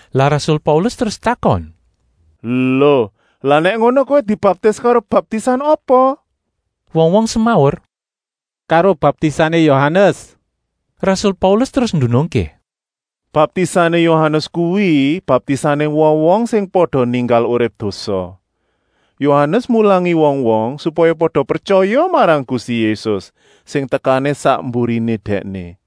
Lah rasul Paulus terus takon: “Lo, lah nèk ngono kowé dibaptis karo baptisan apa?” Wong-wong semaur: “Karo baptisané Yohanes.” Rasul Paulus terus ndunungké: “Baptisané Yohanes kuwi baptisané wong-wong sing pada ninggal urip dosa. Yohanes mulangi wong-wong, supaya pada pretyaya marang Gusti Yésus, sing tekané sak mburiné dèkné.”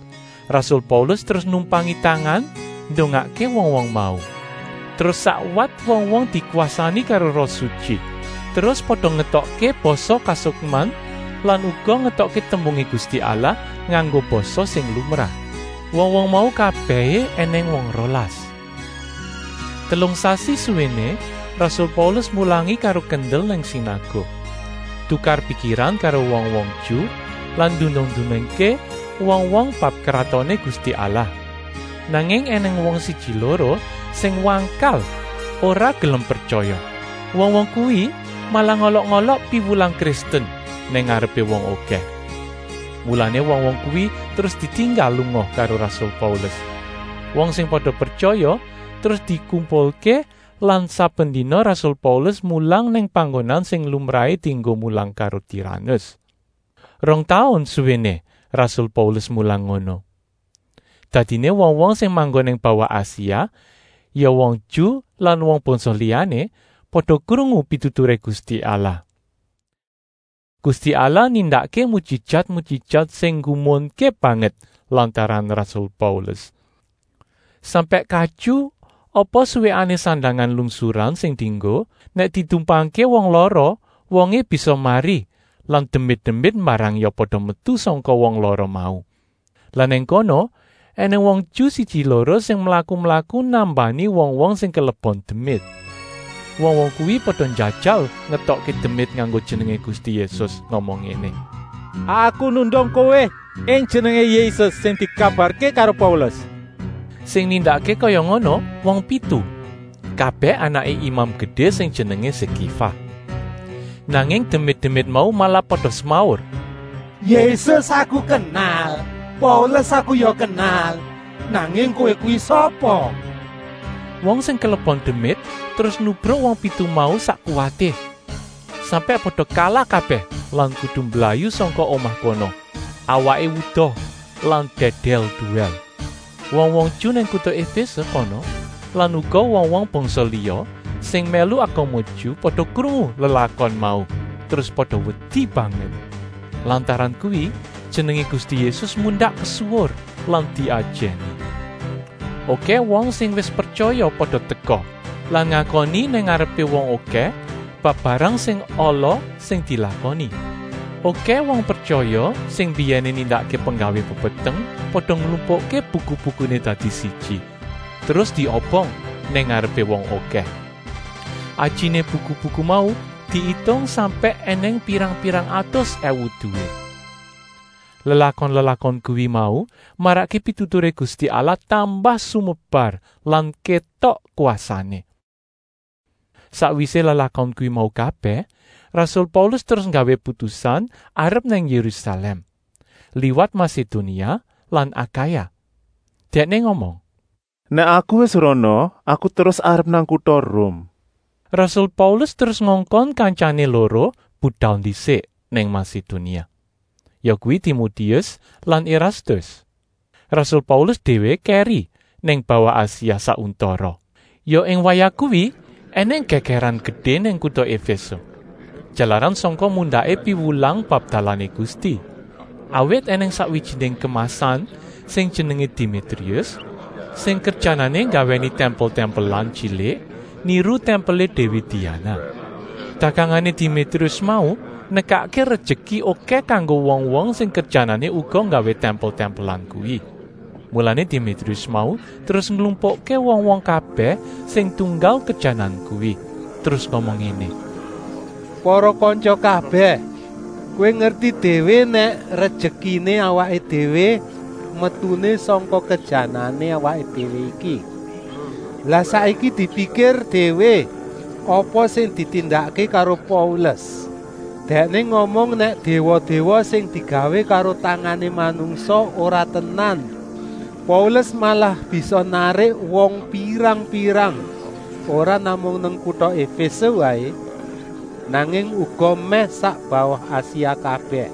Rasul Paulus terus numpangi tangan ndongakké wong-wong mau, terus sakwat wong-wong dikwasani karo Roh Sutyi, terus pada ngetokké basa kasukman lan uga ngetokké tembungé Gusti Allah nganggo basa sing lumrah. Wong-wong mau kabèhé ènèng wong rolas. Telung sasi suwéné rasul Paulus mulangi karo kendel nang sinaguk, tukar-pikiran karo wong-wong Ju lan ndunung-ndunungké wong-wong bab Kratoné Gusti Allah. Nanging ènèng wong siji-loro sing wangkal ora gelem pretyaya. Wong-wong kuwi malah ngolok-olok piwulang Kristen nang ngarepé wong okèh. Mulané wong-wong kuwi terus ditinggal lunga karo rasul Paulus. Wong sing pada pretyaya terus dikumpulké lan saben dina rasul Paulus mulang nang panggonan sing lumrahé dienggo mulang karo Tiranus. Rong taun suwéné rasul Paulus mulang ngono. Dadiné wong-wong sing manggon nang bawah Asia, ya wong Ju lan wong bangsa liyané, pada krungu pituturé Gusti Allah. Gusti Allah nindakké mujijat-mujijat sing nggumunké banget lantaran rasul Paulus. Sampèk katyu apa suwèkané sandangan lungsuran sing dienggo, nèk ditumpangké wong lara wongé bisa mari lan demit-demit mbarang ya pada metu sangka wong lara mau. Lah nang kono ènèng wong Ju siji-loro sing mlaku-mlaku nambani wong-wong sing kelebon demit. Wong-wong kuwi pada njajal ngetokké demit nganggo jenengé Gusti Yésus, ngomong ngéné: “Aku nundung kowé ing jenengé Yésus sing dikabarké karo Paulus!” Sing nindakké kaya ngono wong pitu, kabèh anaké Imam Gedé sing jenengé Sekéfa. Nanging demit-demit mau malah pada semaur: “Yésus aku kenal, Paulus aku ya kenal, nanging kowé kuwi sapa?” Wong sing kelebon demit terus nubruk wong pitu mau sak kuwaté, sampèk pada kalah kabèh lan kudu mblayu sangka omah kono, awaké wuda lan dèdèl-duwèl. Wong-wong Ju nang kuta Efése kono lan uga wong-wong bangsa liya sing mèlu agama Ju pada krungu lelakon mau terus pada wedi banget. Lantaran kuwi jenengé Gusti Yésus mundak kesuwur lan diajèni. Okèh wong sing wis pretyaya pada teka lan ngakoni nang ngarepé wong okèh bab barang sing ala sing dilakoni. Okèh wong pretyaya sing mbiyèné nindakké penggawé pepeteng pada nglumpukké buku-bukuné dadi siji, terus diobong nang ngarepé wong okèh. Ajiné buku-buku mau diitung sampèk ènèng pirang-pirang atus èwu duwit. Lelakon-lelakon kuwi mau marakké pituturé Gusti Allah tambah sumebar lan kétok kwasané. Sakwisé lelakon kuwi mau kabèh, rasul Paulus terus nggawé putusan arep nang Yérusalèm, liwat Masedonia lan Akaya. Dèkné ngomong: “Nèk aku wis rana, aku terus arep nang kuta Rum.” Rasul Paulus terus ngongkon kantyané loro budal ndisik nang Masedonia, yakuwi Timotius lan Erastus. Rasul Paulus déwé kèri nang bawah Asia sak untara. Ya ing wayah kuwi ènèng gègèran gedé nang kuta Efése, jalaran sangka mundaké piwulang bab dalané Gusti. Awit ènèng sakwijiné kemasan sing jenengé Demitrius, sing kerjanané nggawèni tèmpel-tèmpelan tyilik, niru tèmpelé déwi Diana. Dagangané Demitrius mau nekakké rejeki okèh kanggo wong-wong sing kerjanané uga nggawé tèmpel-tèmpelan kuwi. Mulané Demitrius mau terus nglumpukké wong-wong kabèh sing tunggal kerjanan kuwi, terus ngomong ngéné: “Para kantya kabèh, kowé ngerti déwé nèk rejekiné awaké déwé metuné sangka kerjanané awaké déwé iki. Lah saiki, dipikir déwé apa sing ditindakké karo Paulus. Dèkné ngomong nèk déwa-déwa sing digawé karo tangané manungsa ora tenan. Paulus malah bisa narik wong pirang-pirang, ora namung nang kuta Efése waé, nanging uga mèh sak bawah Asia kabèh.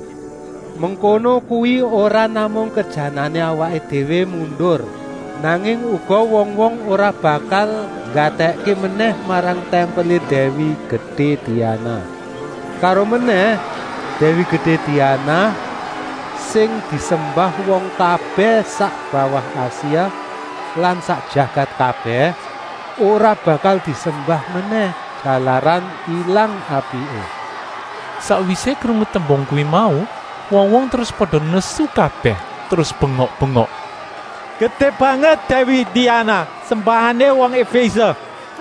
Mengkono kuwi ora namung kerjanané awaké déwé mundur, nanging uga wong-wong ora bakal nggatèkké menèh marang tèmpelé Déwi Gedé Diana. Karomenèh, Déwi Gedé Diana, sing disembah wong kabèh sak bawah Asia lan sak jagat kabèh, ora bakal disembah menèh, jalaran ilang apiké.” Sakwisé krungu tembung kuwi mau, wong-wong terus pada nesu kabèh, terus bengok-bengok: “Gedé banget Déwi Diana, sembahané wong Efése!”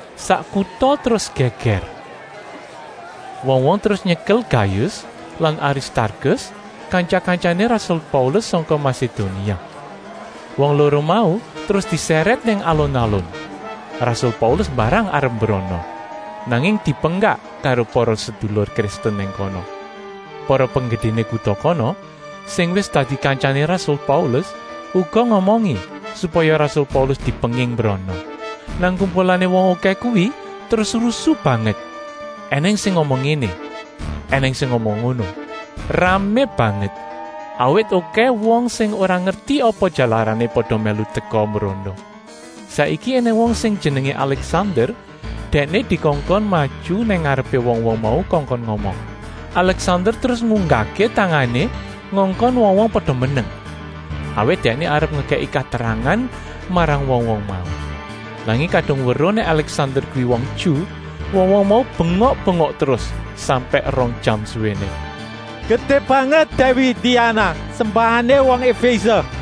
Sak kuta terus gègèr. Wong-wong terus nyekel Gayus lan Aristarkus, kantya-kantyané rasul Paulus sangka Masedonia. Wong loro mau terus disèrèt nang alun-alun. Rasul Paulus mbarang arep mbrono, nanging dipenggak karo para sedulur Kristen nang kono. Para penggedéné kuta kono, sing wis dadi kantyané rasul Paulus, uga ngomongi, supaya rasul Paulus dipenging mbrono. Nang kumpulané wong okèh kuwi terus rusu banget, ènèng sing ngomong ngéné, ènèng sing ngomong ngono, ramé banget, awit okèh wong sing ora ngerti apa jalarané pada mèlu teka mbrono. Saiki ènèng wong sing jenengé Alèksander, dèkné dikongkon maju nang ngarepé wong-wong mau kongkon ngomong. Alèksander terus ngunggahké tangané ngongkon wong-wong pada meneng, awit dèkné arep ngekèki katerangan marang wong-wong mau. Nanging kadung weruh nèk Alèksander kuwi wong Ju, wong-wong mau bengok-bengok terus sampèk rong jam suwéné: “Gedé banget Déwi Diana, sembahané Efése!”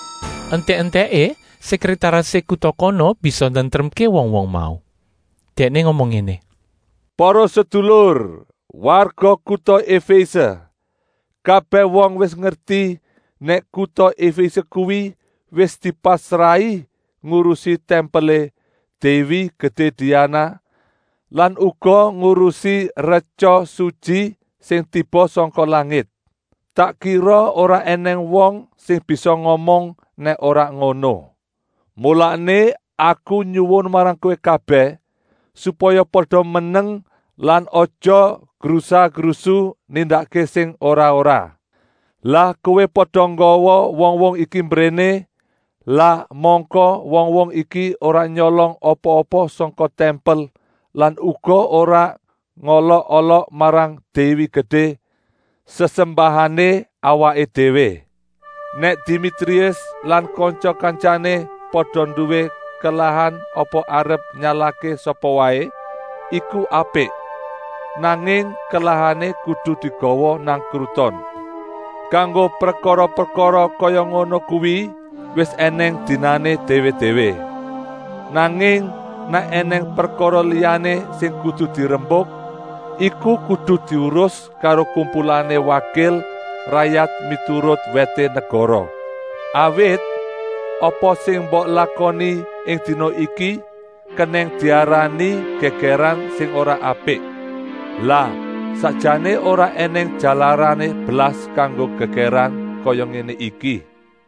Entèk-entèké sèkrètarisé kuta kono bisa nentremké wong-wong mau. Dèkné ngomong ngéné: “Para sedulur, warga kuta Efése! Kabèh wong wis ngerti nèk kuta Efése kuwi wis dipasrahi ngurusi tèmpelé Déwi Gedé Diana lan uga ngurusi retya sutyi sing tiba sangka langit. Tak kira ora ènèng wong sing bisa ngomong nèk ora ngono. Mulané aku nyuwun marang kowé kabèh, supaya pada meneng lan aja grusa-grusu nindakké sing ora-ora. Lah kowé pada nggawa wong-wong iki mbréné, lah mangka wong-wong iki ora nyolong apa-apa sangka tèmpel lan uga ora ngolok-olok marang Déwi Gedé, sesembahané awaké déwé. Nèk Demitrius lan kantya-kantyané pada nduwé kelahan apa arep nyalahké sapa waé, iku apik, nanging kelahané kudu digawa nang kruton. Kanggo prekara-prekara kaya ngono kuwi wis ènèng dinané déwé-déwé. Nanging nèk ènèng prekara liyané sing kudu dirembuk, iku kudu diurus karo kumpulané wakil rayat miturut wèté negara. Awit, apa sing mbok lakoni ing dina iki kenèng diarani gègèran sing ora apik. Lah sakjané ora ènèng jalarané blas kanggo gègèran kaya ngéné iki.”